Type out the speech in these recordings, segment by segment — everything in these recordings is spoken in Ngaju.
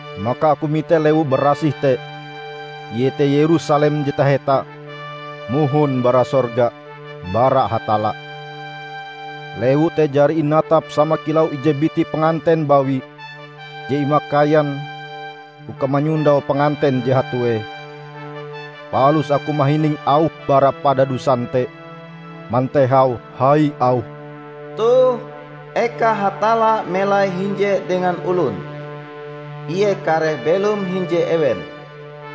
Maka aku mite lewu barasih te, iete Yerusalem je taheta, mohon bara sorga, bara Hatalla. Lewu te jari inatap sama kilau ije biti panganten bawi je imakaian uka manyondau panganten je hatue. Palus aku mahining auh bara padadusan te mantehau hai auhe, "Toh, eka Hatalla melai hinje dengan olon! Ie kareh belom hinje ewen,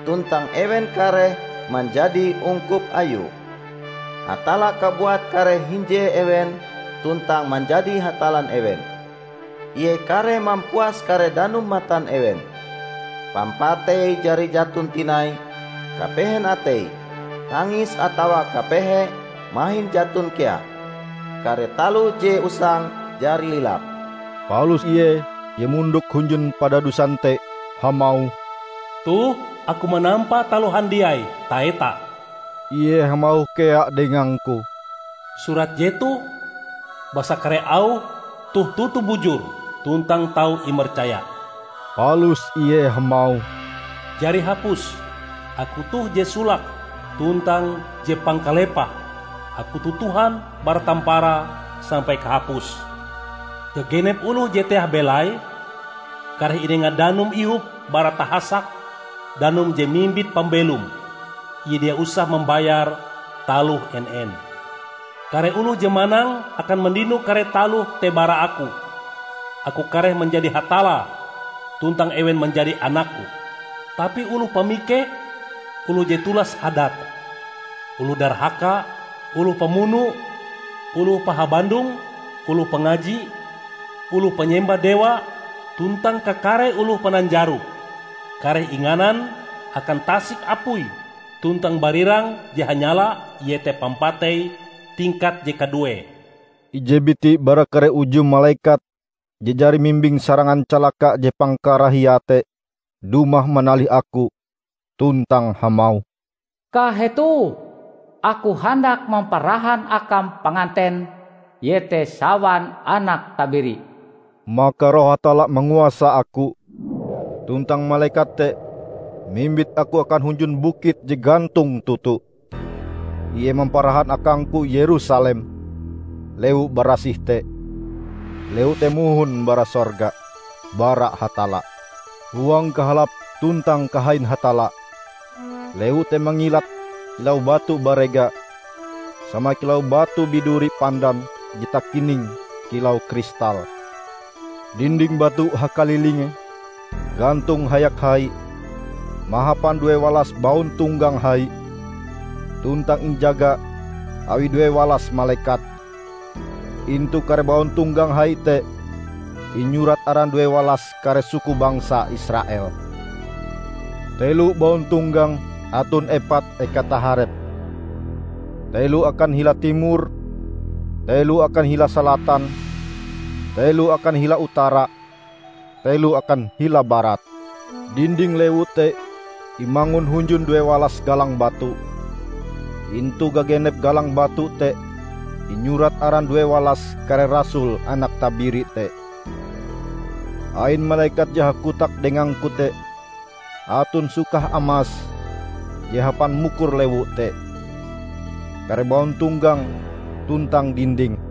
tuntang ewen kareh manjadi ungkup Ayue. Hatalla kabuat kareh hinje ewen tuntang manjadi Hatallan ewen. Ie kareh mampuas kare danum matan ewen. Pampatei jari jaton tinai; kapehen atei, tangis atawa kapehe mahin jaton kea. Kare taloh je usang jari lilap." Palus Ie je mondok hunjun padadusan te hamauh, "Toh Aku manampa taloh handiai taheta!" Ie hamauh kea dengangku, "Surat jetoh, basa kare auh toh toto bujur tuntang tau imercaya." Palus Ie hamauh, "Jari hapus! Aku toh je solake tuntang je pangkalepahe; Aku toh Tuhan bara tamparae sampai kahapuse. Gagenep oloh je teah belaie, kareh inenga danum ihop bara tahasak danum je mimbit pambelom. Ie dia usah mambayar taloh en-en. Kare oloh je manang akan mandino kare taloh te bara Aku. Aku kareh manjadi Hatallae, tuntang ewen manjadi anak-Ku. Tapi oloh pamikeh, oloh je tulas hadate, oloh darhaka, oloh pamuno, oloh pahabandong, oloh pangaji, oloh panyembah dewa, tuntang kakare oloh pananjaro, kareh inganan akan tasik apui tuntang barirang je hanyala, iete pampatei tingkat je kaduee." Ije biti bara kare uju malekat je jari mimbing sarangan calaka je pangkarahiae te dumah manalih aku tuntang hamauh, "Kahetoh! Aku handak mamparahan akam Panganten, iete sawan Anak Tabiri." Maka Roh Hatalla manguasa Aku, tuntang malekat te mimbit Aku akan hunjun bukit je gantong toto. Ie mamparahan akangku Yerusalem, lewu barasih te, lewu te mohon bara sorga, bara Hatalla, huang kahalap tuntang kahain Hatalla. Lewu te mangilat kilau batu barega sama kilau batu biduri pandan je takining kilau kristal. Dinding batu hakalilinge gantong hayak hai, mahapan duewalas bauntonggang hai, tuntang injaga awi duewalas malekat. Intu kare bauntonggang hai te inyurat aran duewalas kare suku bangsa Israel. Telo bauntonggang aton epat eka taharepe: telo akan hila timur, telo akan hila salatan, telo akan hila utara, telo akan hila barat. Dinding lewu te imangun hunjun duewalas galang batu. Intu gagenep galang batu te inyurat aran duewalas kare rasul Anak Tabiri te. Ain malekat je hakotak dengangku te aton sukah amas je hapan mukur lewu te, kare bauntonggang tuntang dindinge.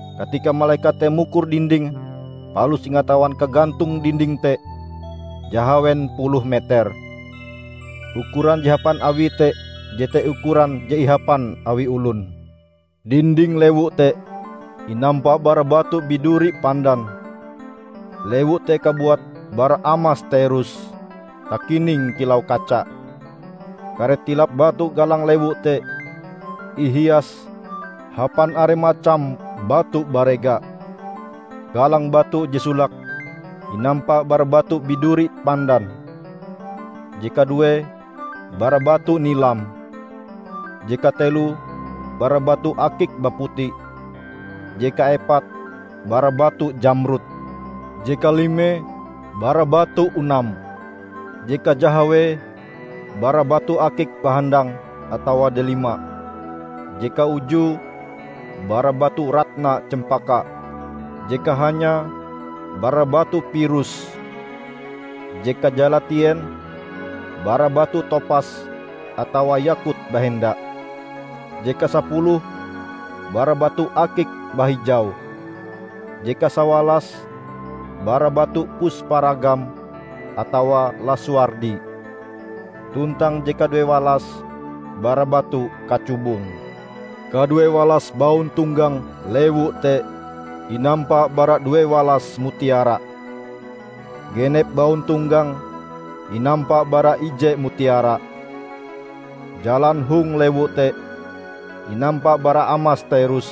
Katika malekat te mukur dindinge, palus ingatawan kagantong dinding te jahawen puluh meter. Ukuran je hapan awie te jete ukuran je ihapan awi olon. Dinding lewu te inampa bara batu biduri pandan, lewu te kabuat bara amas terus, takining kilau kaca. Kare tilap batu galang lewu te ihias hapan are macam batu barega. Galang batu je solake inampa bara batu biduri pandan, je kaduee bara batu nilam, je kateloe bara batu akik baputi, je kaepate bara batu jamrud, je kalime bara batu unam, je kajahawee bara batu akik bahandang atawa delima, je kaujue bara batu ratna cempaka, je kahanyae bara batu pirus, je kajalatien bara batu topas atawa yakut bahenda, je kasapuluh bara batu akik bahijau, je kasawalas bara batu pusparagam atawa lasuardi, tuntang je kaduewalas bara batu kacubung. Kaduewalas bauntonggang lewu te inampa bara duewalas mutiara, genep bauntonggang inampa bara ije mutiara. Jalan hong lewu te inampa bara amas terus,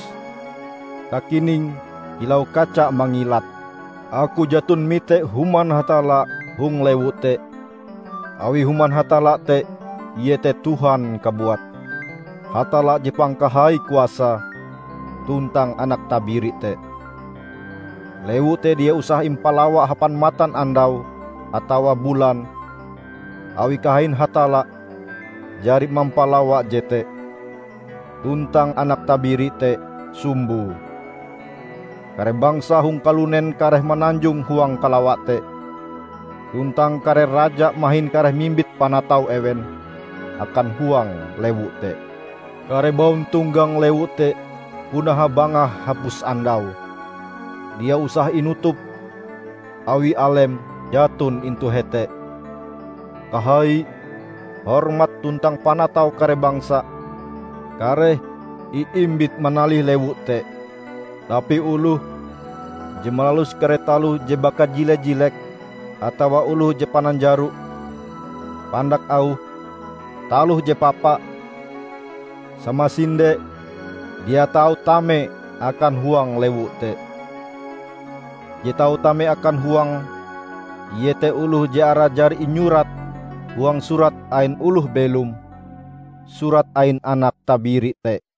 takining kilau kaca mangilat. Aku jaton mite Human Hatalla hong lewu te, awi Human Hatalla te iete Tuhan kabuat, Hatalla Je Pangkahai Kuasae, tuntang Anak Tabiri te. Lewu te dia usah impalawa hapan matanandau atawa bulan, awi kahain Hatalla jari mampalawa jete, tuntang Anak Tabiri te sumboe. Kare bangsa hong kalunen kareh mananjong huang kalawa te, tuntang kare raja mahin kareh mimbit panatau ewen akan huang lewu te. Kare bauntonggang lewu te puna habangah hapus andau; dia usah inutup, awi alem jaton intu hete. Kahai, hormat tuntang panatau kare bangsa kareh iimbit manalih lewu te. Tapi oloh je malalus kare taloh je bakajile-jilek, atawa oloh je pananjaro -- pandak auh taloh je papa, samasinde dia tau tame akan huang lewu te. Je tau tame akan huange, iete oloh je arae jari inyurat huang Surat ain Oloh Belom, surat ain Anak Tabiri te.